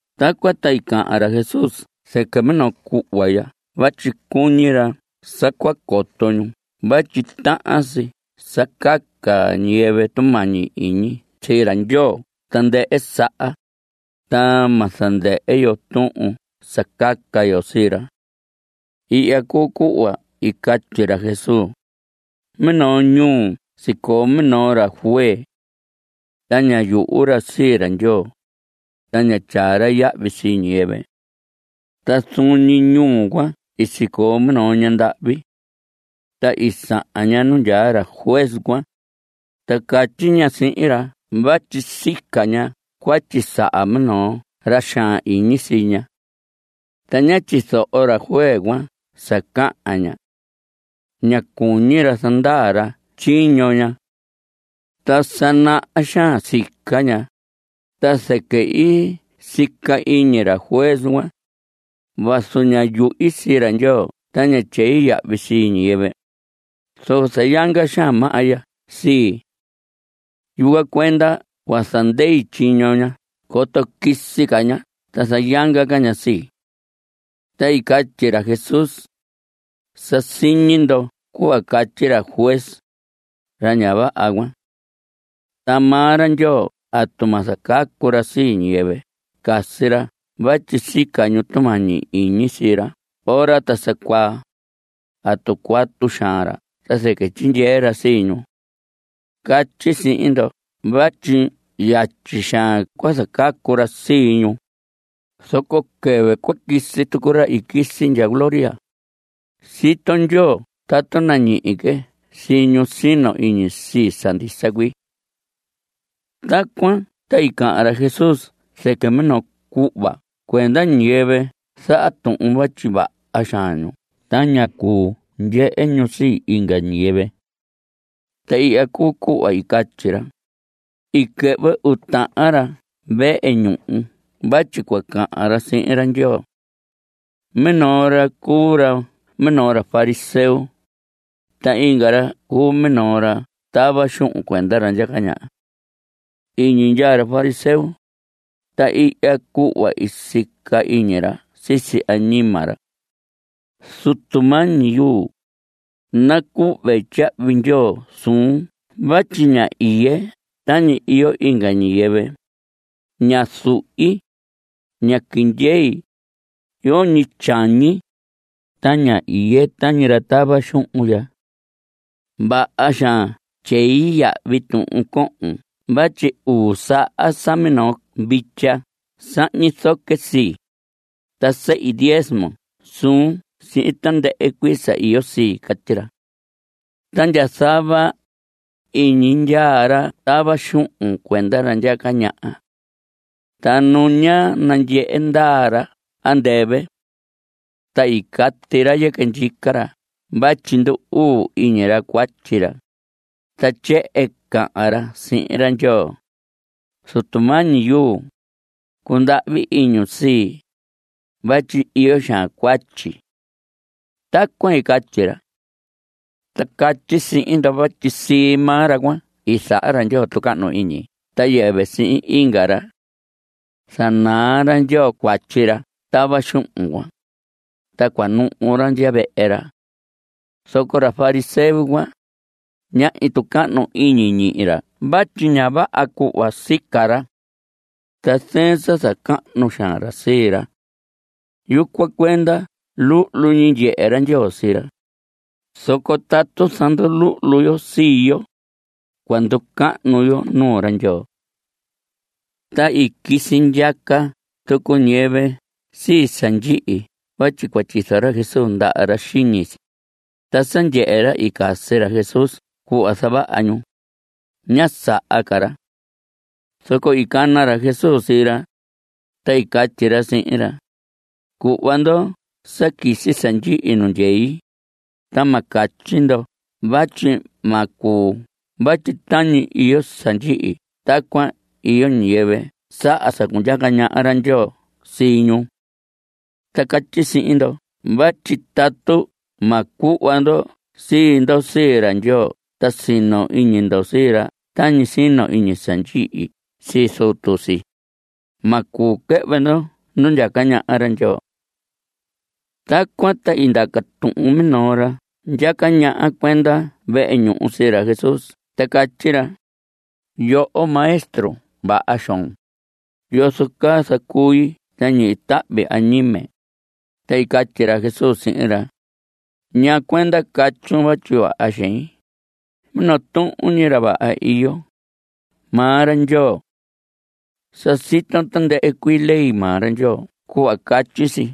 Tacuan ta i cahan ra Jesús zɨquɨ minoo cuhva ya vatyi cuñi ra sa cua coto ñu vatyi tahan si sa caca ñiyɨvɨ tumañi iñi sii ra Ndyoo tandɨhɨ saha, ta ma zandɨhɨ yo tuhun sa caca yo sii ra. Ihya cuu cuhva i catyi ra Jesús: Minoo ñuu sicoo minoo ra juez. Ta ña yuhu ra sii ra Ndyoo. Ta ña tyaa ra yahvi sii ñiyɨvɨ. Ta zuun ñi ñuu cuan sicoo minoo ñandahvi. Ta i sahan ña nu ndyaa ra juez cuan, ta catyi ña sihin ra vatyi sica ña cuatyi saha minoo ra xaan iñi sii ña. Ta ña tyizoho ra juez cuan sa cahan ña. Ña cuñi ra zandaa ra tyiño ña. Ta sa naha xaan sica ña. Ta zɨquɨ i sica iñi ra juez: “Vazu ña yuhi sii ra Ndyoo ta ña tyei yahvi sii ñiyɨvɨ, zoco zayanga xaan maha ya sii. Yucuan cuenda cua zandei tyiño ña coto quisi ca ña ta zayanga ca ña sii.” Ta i catyi ra Jesús: Sa siñi ndo cuhva catyi ra juez, ra ña vaha cuan. Ta maa ra Ndyoo ¿atu ma zacacu ra sii ñiyɨvɨ i casi ra vatyi sica ñu tumañi iñi sii ra ora ta sa cuaa? ¿Atu cuatu xaan ra ta zɨquɨ tyindyee ra sii ñu? Catyi sihin ndo vatyi yatyi xaan cua zacacu ra sii ñu. Zoco quɨvɨ cua quisi tucu ra i quisi ndya gloria, sito Ndyoo tatu nañihi que sii ñu sino iñi sii, sa ndisa cuii. Tacuan ta i cahan ra Jesús zɨquɨ minoo cuhva cuenda ñiyɨvɨ zaha tuhun vatyi vaha xaan ñu ta ña cuu ndyehe ñu sii inga ñiyɨvɨ. Ta ihya cuu cuhva i catyi ra: I quɨhvɨ uu tahan ra vehe ñuhu vatyi cua cahan ra sihin ra Ndyoo. Minoo ra cuu ra minoo ra fariseo, ta inga ra cuu minoo ra tava xuhun cuenda ra ndyaca ñaha. Iñi ndyaa ra fariseo, ta ihya cuhva i sica iñi ra sisi añima ra: “Zutu mañi yuu, nacuhve tyahvi ndyoo suun vatyi ña iye tañi iyo inga ñiyɨvɨ. Ña zuhi. Ña quiñi iye. Yoñi tyañi. Ta ña iye tañi ra tava xuhun ya. Vaha xaan tyei yahvi tuhun cohon vatyi uu saha sa minoo vitya sahñi zoque sii, ta sehi diezmo suun sihin tandɨhɨ cuii sa iyo sii.” Catyi ra. Ta ndya zava, iñi ndyaa ra tava xuhun cuenda ra ndyaca ñaha. Ta nu ña nandyehe ndaa ra andɨvɨ. Ta cati ra yɨquɨ ndyica ra vatyi ndu‑uu iñi ra cuatyi ra. Ta tyehen cahan ra sihin ra Ndyoo: “Zutu mañi yuu, cundahvi iñun sii, vatyi iyo xaan cuatyi.” Tacuan i catyi ra. Ta catyi sihin ndo vatyi sii maa ra cuan i zaha ra Ndyoo tucahnu iñi ta yɨvɨ sii inga ra. Zanaa ra Ndyoo cuatyi ra tava xuhun cuan, ta cuanuhu ra ndya vehe ra. Zoco ra fariseo cuan, ñahñi tucahnu iñi ñihi ra vatyi ña vaha cuhva sica ra. Ta zɨɨn sa zacahnu xaan ra sii ra. Yucuan cuenda luhlu ñi ndyehe ra Ndyoo sii ra. Zoco tatu zanduluhlu yo sii yo, cua nducahnu yo nuu ra Ndyoo. Ta i quisi ndyaca tucu ñiyɨvɨ sii sa ndyihi vatyi cua tyizo ra Jesús ndaha ra xiñi si. Ta sa ndyehe ra i casi ra Jesús cuhva zavaha ñu, ñá saha ca ra. Zoco i cana ra Jesús sii ra, ta i catyi ra sihin ra: Cuhva ndo sa quisi sa ndyihi nu ndyei, ta ma catyi ndo vatyi ma cuu vatyi tañi iyo sa ndyihi tacuan iyo ñiyɨvɨ saha sa cundyaca ñaha ra Ndyoo sii ñu. Ta catyi sihin ndo vatyi tatu ma cuhva ndo sii ndo sii ra Ndyoo ta sino iñi ndo sii ra tañi sino iñi sa ndyihi sii zutu si, ma cuu quɨhvɨ ndo nu ndyaca ñaha ra Ndyoo. Tacuan ta i ndaca tuhun minoo ra ndyaca ñaha cuenda vehe ñuhu sii ra Jesús ta catyi ra: Yoho maestro vaha xoon, ¿yozo caa zacui ta ñihi tahvi añime? Ta i catyi ra Jesús sihin ra: ¿Ñaa cuenda catyun vatyi vaha xein? Minoo tuhun ñi ra vaha iyo, maa ra Ndyoo. Sa siton tandɨhɨ cuii ley maa ra Ndyoo cuhva catyi si: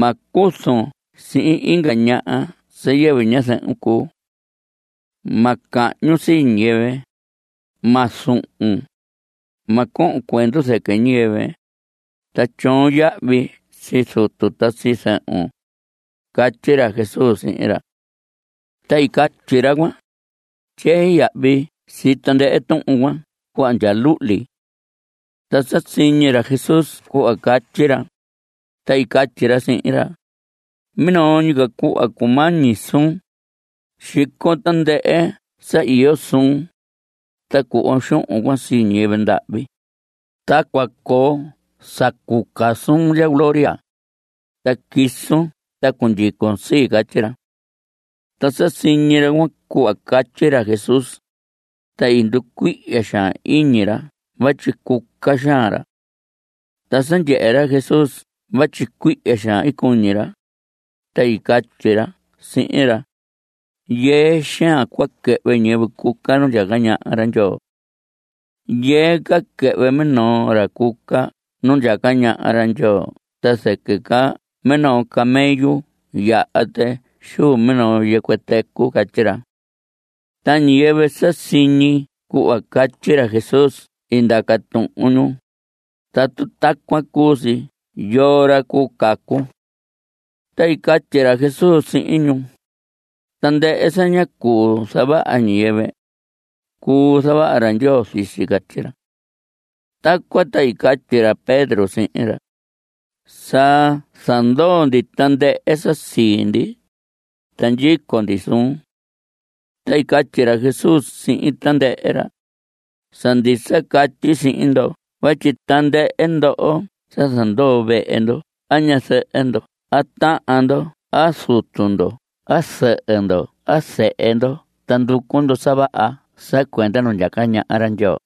“Ma cuzun sihin inga ñaha sa yɨvɨ ñazɨhun cuu. Ma cahñun sii ñiyɨvɨ. Ma zuhun. Ma cohon cuendu zɨquɨ ñiyɨvɨ. Ta tyoon yahvi sii zutun ta sii zɨhun.” Catyi ra Jesús sihin ra. Ta i catyi ra cuan: Tyei yahvi sii tandɨhɨ tuhun cuan cuhva ndya luhli. Ta sa siñi ra Jesús cuhva catyi ra, ta i catyi ra sihin ra: Minoo ñi ca cuhva cumañi suun. Xicon tandɨhɨ sa iyo suun, ta cuhvon xuhun cuan sii ñiyɨvɨ ndahvi, ta cua coo sa cuca suun ndya gloria, ta quisun ta cundyicon sii. Catyi ra. Ta sa siñi ra cuan cuhva catyi ra Jesús, ta i nducuihya xaan iñi ra vatyi cuca xaan ra. Ta sa ndyehe ra Jesús vatyi cuihya xaan cuñi ra, ta i catyi ra sihin ra: Yɨɨ xaan cua quɨhvɨ ñiyɨvɨ cuca nu ndyaca ñaha ra Ndyoo. Yɨɨ ca quɨhvɨ minoo ra cuca nu ndyaca ñaha ra Ndyoo ta zɨquɨ ca minoo camello yaha tɨ xuu minoo yɨcuɨ tɨcuɨ. Catyi ra. Ta ñiyɨvɨ sa siñi cuhva catyi ra Jesús i ndaca tuhun ñu: Tatu tacuan cuu si ¿yoo ra cuu cacu? Ta i catyi ra Jesús sihin ñu: Tandɨhɨ sa ña cuu zavaha ñiyɨvɨ, cuu zavaha ra Ndyoo sii si. Catyi ra. Tacuan ta i catyi ra Pedro sihin ra: Sa zandoo ndi tandɨhɨ sa sii ndi, ta ndyico ndi suun. Ta i catyi ra Jesús sihin tandɨhɨ ra: Sa ndisa catyi sihin ndo vatyi tandɨhɨ ndo sa zandoo vehe ndo a ñazɨhɨ ndo a tahan ndo a zutu ndo a zɨhɨ ndo a zehe ndo ta nducu ndo sa vaha sa cuenda nu ndyaca ñaha ra Ndyoo,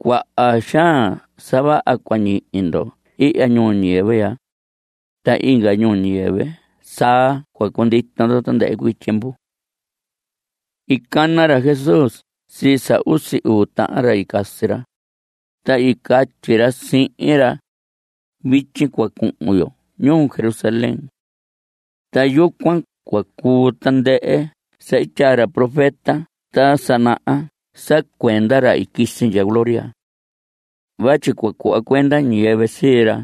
cuaha xaan sa vaha cua ñihi ndo ihya ñuu ñiyɨvɨ ya, ta inga ñuu ñiyɨvɨ saa cua cundito ndo tandɨhɨ cuii tyiemvu. I cana ra Jesús sii sa usi uu tahan ra i casi ra, ta i catyi ra sihin ra: Vityi cua cuhun yo ñuu Jerusalén. Ta yucuan cua cuu tandɨhɨ sa i tyaa ra profeta ta sa naha sa cuenda ra i quisi ndya gloria. Vatyi cua cuhva cuenda ñiyɨvɨ sii ra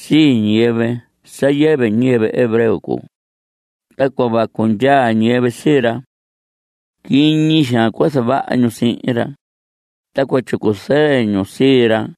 sii ñiyɨvɨ sa yɨvɨ ñiyɨvɨ hebreo cuu, ta cua vacu ndyaa ñiyɨvɨ sii ra. Quiñi xaan cua zavaha ñu sihin ra, ta cua tyicu zɨɨ ñu sii ra.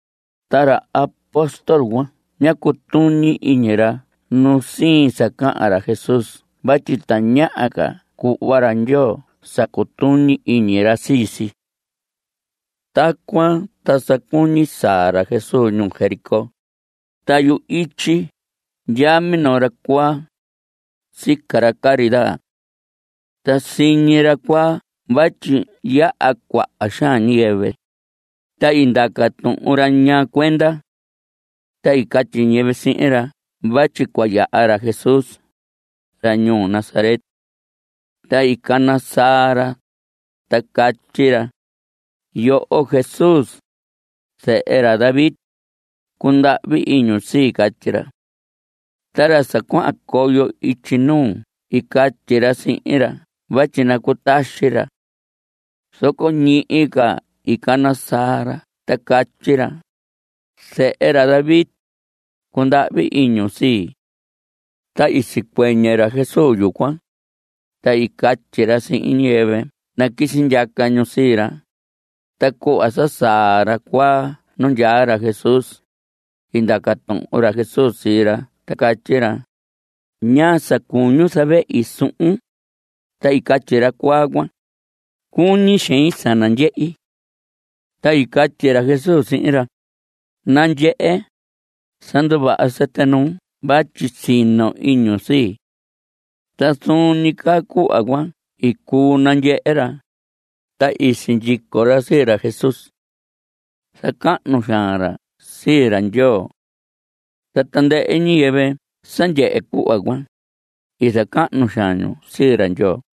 Ta ra apóstol cuan ñá cutuñi iñi ra nusiin sa cahan ra Jesús vatyi tañaha ca cuhva ra Ndyoo sa cutuñi iñi ra sii si. Tacuan ta sa cuñi saa ra Jesús ñuu Jericó, ta yu‑ityi ndyaa minoo ra cuaa, sica ra caridad. Ta siñi ra cuaa vatyi yaha cuaha xaan ñiyɨvɨ, ta i ndaca tuhun ra ñaa cuenda. Ta i catyi ñiyɨvɨ sihin ra vatyi cua yaha ra Jesús, ra ñuu Nazaret. Ta i cana saa ra, ta catyi ra: ¡Yoho Jesús, zehe ra David, cundahvi iñun sii! Catyi ra. Ta ra sa cuahan coyo ityi nuu i catyi ra sihin ra vatyi nacutaxi ra. Zoco ñihi ca i cana saa ra ta catyi ra: ¡Zehe ra David, cundahvi iñun sii! Ta i sicuɨñɨ ra Jesús yucuan, ta i catyi ra sihin ñiyɨvɨ naquisi ndyaca ñu sii ra. Ta cuhva sa saa ra cuaa nu ndyaa ra Jesús, i ndaca tuhun ra Jesús sii ra ta catyi ra: ¿Ñaa sa cuñun zavehi suhun? Ta i catyi ra cuaa cuan: Cuñi xein sa nandyehi. Ta i catyi ra Jesús sihin ra: Nandyehe. Sa nduvaha sɨtɨ nuun vatyi sino iñun sii. Ta zuun ñi caa cuhva cuan i cuu nandyehe ra, ta i sindyico ra sii ra Jesús. Zacahnu xaan ra sii ra Ndyoo. Ta tandɨhɨ ñiyɨvɨ sa ndyehe cuhva cuan, i zacahnu xaan ñu sii ra Ndyoo.